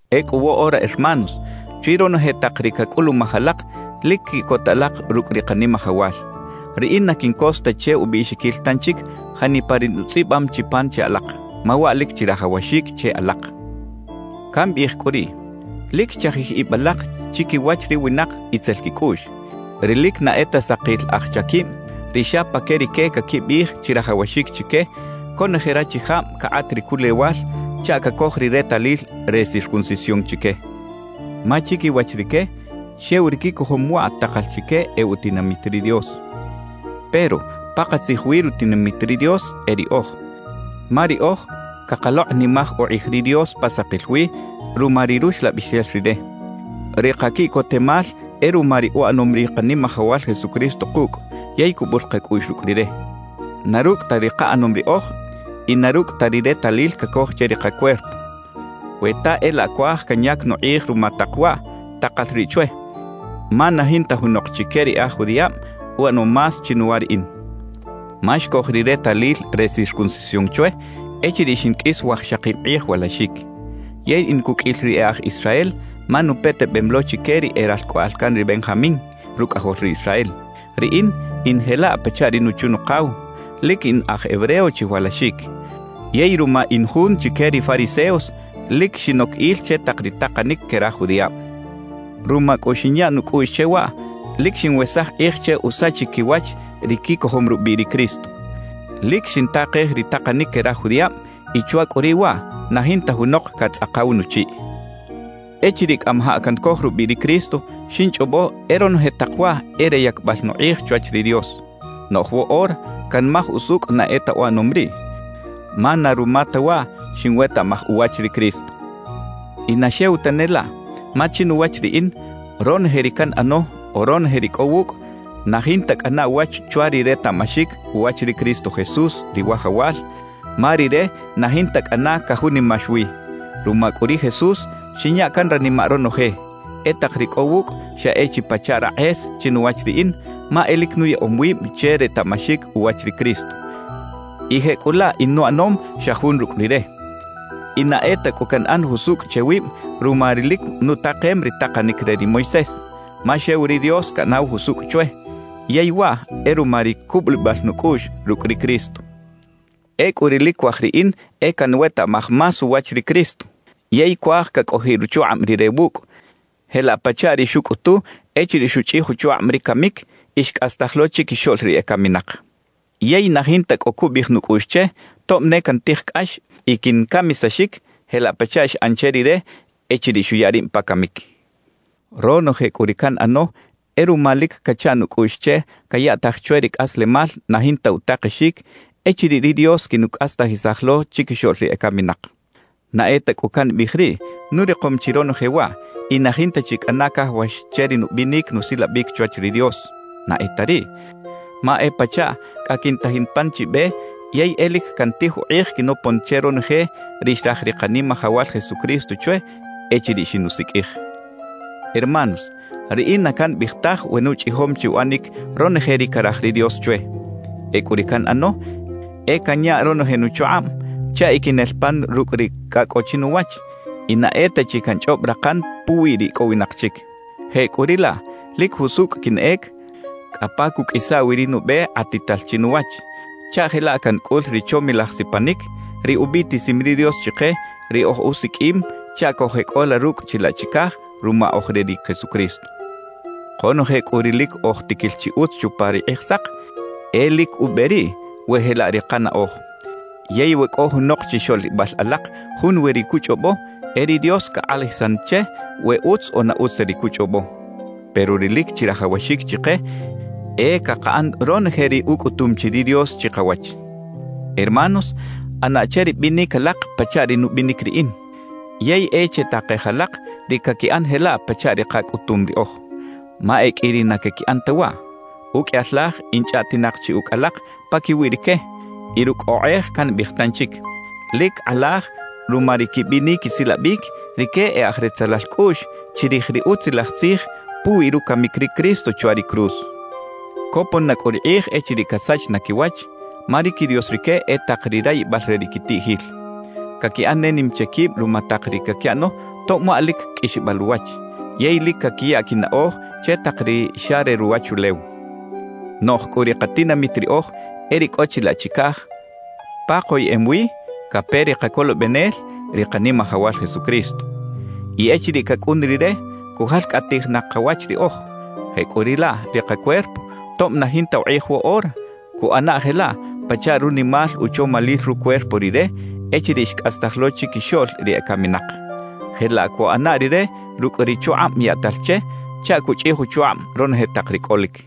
Ecꞌu woꞌora hermanos, chwi ronoje tak ri cacꞌulumaj alak, lic quiꞌcota alak rucꞌ ri Kanimajawal. Riꞌin na quincos ta che ubiꞌxiquil tanchic janipa ri nutzꞌibam chi pan che alak, ma waꞌ lic chirajawaxic che alak. Cambiꞌij cꞌu riꞌ: Lic chajij ib alak chiquiwach ri winak itzel quicꞌuꞌx, ri lic na e ta sakil aj chaquib, ri xa pa que rique caquibiꞌij chirajawaxic chique conoje rachijab cakꞌat ri culewal chaꞌ cacoj ri retalil re circuncisión chique. Ma chiquiwach rique, xew ri quicojom waꞌ takal chique e utinamit ri Dios. Pero pakatzij wi rutinamit ri Dios e riꞌoj, ma riꞌoj cakalokꞌnimaj ukꞌij ri Dios pa sakil wi ruma ri Ruxlabixel Rire. Ri kaquiꞌcotemal e ruma ri uꞌanom ri Kanimajawal Jesucristo kucꞌ yey cubul kacꞌuꞌx rucꞌ Rire, na rucꞌ ta ri kaꞌanom riꞌoj y na rucꞌ ta ri retalil cacoj che ri kacuerpo. We ta e laꞌ cuaj canyac nukꞌij ruma tak waꞌ, takal riꞌ chwe, ma na jinta junok chique ri e aj judiꞌab uꞌanom más chinuwa riꞌin. Ma xcoj ri retalil re circuncisión chwe echiriꞌ xinqꞌuis wajxakib kꞌij walaxic. Yey in cuqꞌuil ri e aj Israel ma nupetebem lo chique ri e ralcꞌoꞌal can ri Benjamín, rucꞌajol ri Israel. Riꞌin, in jelaꞌ pachaꞌ ri nuchu-nukaw, lic in aj hebreo chiwalaxic. Yey ruma in jun chique ri fariseos, lic xinoc il che tak ri takanic que raj judiꞌab. Ruma cꞌu xinya nucꞌuꞌx che waꞌ, lic xinwesaj kꞌij che usachic quiwach ri quicojom rubiꞌ ri Cristo. Lic xintakej ri takanic que raj judiꞌab y chwa cꞌu riꞌ waꞌ, na jinta junok catzꞌakaw nuchiꞌ. Echiriꞌ cꞌamajaꞌ cancoj rubiꞌ ri Cristo, xinchꞌobo e ronoje tak waꞌ e re yacbal nukꞌij chwach ri Dios; noꞌj woꞌora canmaj usucꞌ na e ta uꞌanom riꞌ, ma na ruma ta waꞌ xinwetaꞌmaj uwach ri Cristo. Y na xew tane laꞌ, ma chinuwach riꞌin, ronoje ri canꞌano o ronoje ri cꞌo wucꞌ, na jinta cꞌana uwach chwa ri retaꞌmaxic uwach ri Cristo Jesús, ri Wajawal, ma Rire na jinta cꞌana cajunimax wi. Ruma cꞌu ri Jesús, xinya can ranimaꞌ ronoje; e tak ri cꞌo wucꞌ xa e chi pachaꞌ rakꞌes chinuwach riꞌin, ma e lic nuyaꞌom wib che retaꞌmaxic uwach ri Cristo y jecꞌulaꞌ in uꞌanom xa jun rucꞌ Rire. Y na e ta cꞌu canꞌan jusucꞌ che wib ruma ri lic nutakem ri takanic re ri Moisés; ma xew ri Dios caꞌanaw jusucꞌ chwe, yey waꞌ e ruma ri cubulibal nucꞌuꞌx rucꞌ ri Cristo. Ecꞌu ri lic cuaj riꞌin e canwetaꞌmaj más uwach ri Cristo. Yey cuaj cacꞌojiꞌ ruchukꞌab Rire wucꞌ, jelaꞌ pachaꞌ ri xucꞌutu echiriꞌ xuchꞌij uchukꞌab ri camic y xcꞌastaj lo chiquixoꞌl ri ecaminak. Yey na jinta cꞌo cubiꞌij nucꞌuꞌx che tob ne cantij cꞌax y quincamisaxic jelaꞌ pachaꞌ xꞌan che Rire echiriꞌ xuya rib pa camic. Ronoje cꞌu ri canꞌano e ruma lic cacha nucꞌuꞌx che cayaꞌtaj chwe ri cꞌaslemal na jinta utakexic echiriꞌ ri Dios quinucꞌastajisaj lo chiquixoꞌl ri ecaminak. Na e ta cꞌu cambiꞌij riꞌ nurikom chi ronoje waꞌ y na jinta chi cꞌana cajawax che ri nubinic nusilabic chwach ri Dios. Na e ta riꞌ. Ma e pachaꞌ cꞌa quintajin pan chi be yey e lic cantij ukꞌij quinopon che ronoje ri xraj ri Kanimajawal Jesucristo chwe echiriꞌ xinusiqꞌuij. Hermanos, riꞌin na cambiꞌij taj we nuchꞌijom chi uꞌanic ronoje ri caraj ri Dios chwe. Ecꞌu ri canꞌano e canya ronoje nuchukꞌab chaꞌ e quinel pan rucꞌ ri cꞌa cꞌo chinuwach y na e ta chi canchꞌob rakan puwi ri icꞌowinak chic. Jecꞌuriꞌlaꞌ lic jusucꞌ quinꞌec cꞌa pa cuꞌqꞌuisa wi ri nube kꞌatital chinuwach, chaꞌ jelaꞌ cancꞌul ri chomilaj sipanic, ri ubiꞌtisim ri Dios chike ri ojusiqꞌuim chaꞌ cojeꞌcꞌola rucꞌ chilaꞌ chicaj ruma oj re ri Jesucristo. Konoje cꞌu ri lic oj tiquil chi utz chupa ri Kꞌijsak, e lic ube riꞌ we jelaꞌ ri kanaꞌoj. Yey we cꞌo junok chixoꞌlibal alak junwi ri cuchꞌobo, e ri Dios cakꞌalajisan che we utz o na utz ta ri cuchꞌobo. Pero ri lic chirajawaxic chike e cakaꞌan ronoje ri ucꞌutum chi ri Dios chikawach. Hermanos, ꞌana che ri binic alak pachaꞌ ri nubinic riꞌin. Yey e chetakej alak ri caquiꞌan jelaꞌ pachaꞌ ri kacꞌutum riꞌoj. Ma e qꞌui ri na caquiꞌan ta waꞌ. Uqꞌuiyal laj in chꞌaꞌtinak chi ucꞌ alak paquiwi rique, y rucꞌ okꞌej cambiꞌij tanchic: Lic kꞌalaj ruma ri quibinic quisilabic, rique e aj retzelal cꞌuꞌx chirij ri Utzilaj Tzij puwi rucamic ri Cristo chwa ri cruz. Copon na cꞌu ri kꞌij echiriꞌ casach na quiwach, ma ri quidios rique e tak ri rayibal re ri quitiꞌjil. Caquiꞌan ne nim che quib ruma tak ri caquiꞌano tob waꞌ lic qꞌuixbal uwach, yey lic caquiya quinaꞌoj che tak ri xa re ruwachulew. Noꞌj cꞌu ri katinamit riꞌoj e ri cꞌo chilaꞌ chicaj, pa koyeꞌem wi cape ri Kacolobenel, ri Kanimajawal Jesucristo. Y echiriꞌ cacꞌun Rire, cujalcꞌatij na kawach riꞌoj. Jecꞌuriꞌlaꞌ ri kacuerpo, tob na jinta ukꞌij woꞌora, cuꞌana jelaꞌ pachaꞌ runimal uchomalil rucuerpo Rire echiriꞌ xcꞌastaj lo chiquixoꞌl ri ecaminak. Jelaꞌ cuꞌana Rire rucꞌ ri chukꞌab yaꞌtal che chaꞌ cuchꞌij uchukꞌab ronoje tak ri cꞌolic.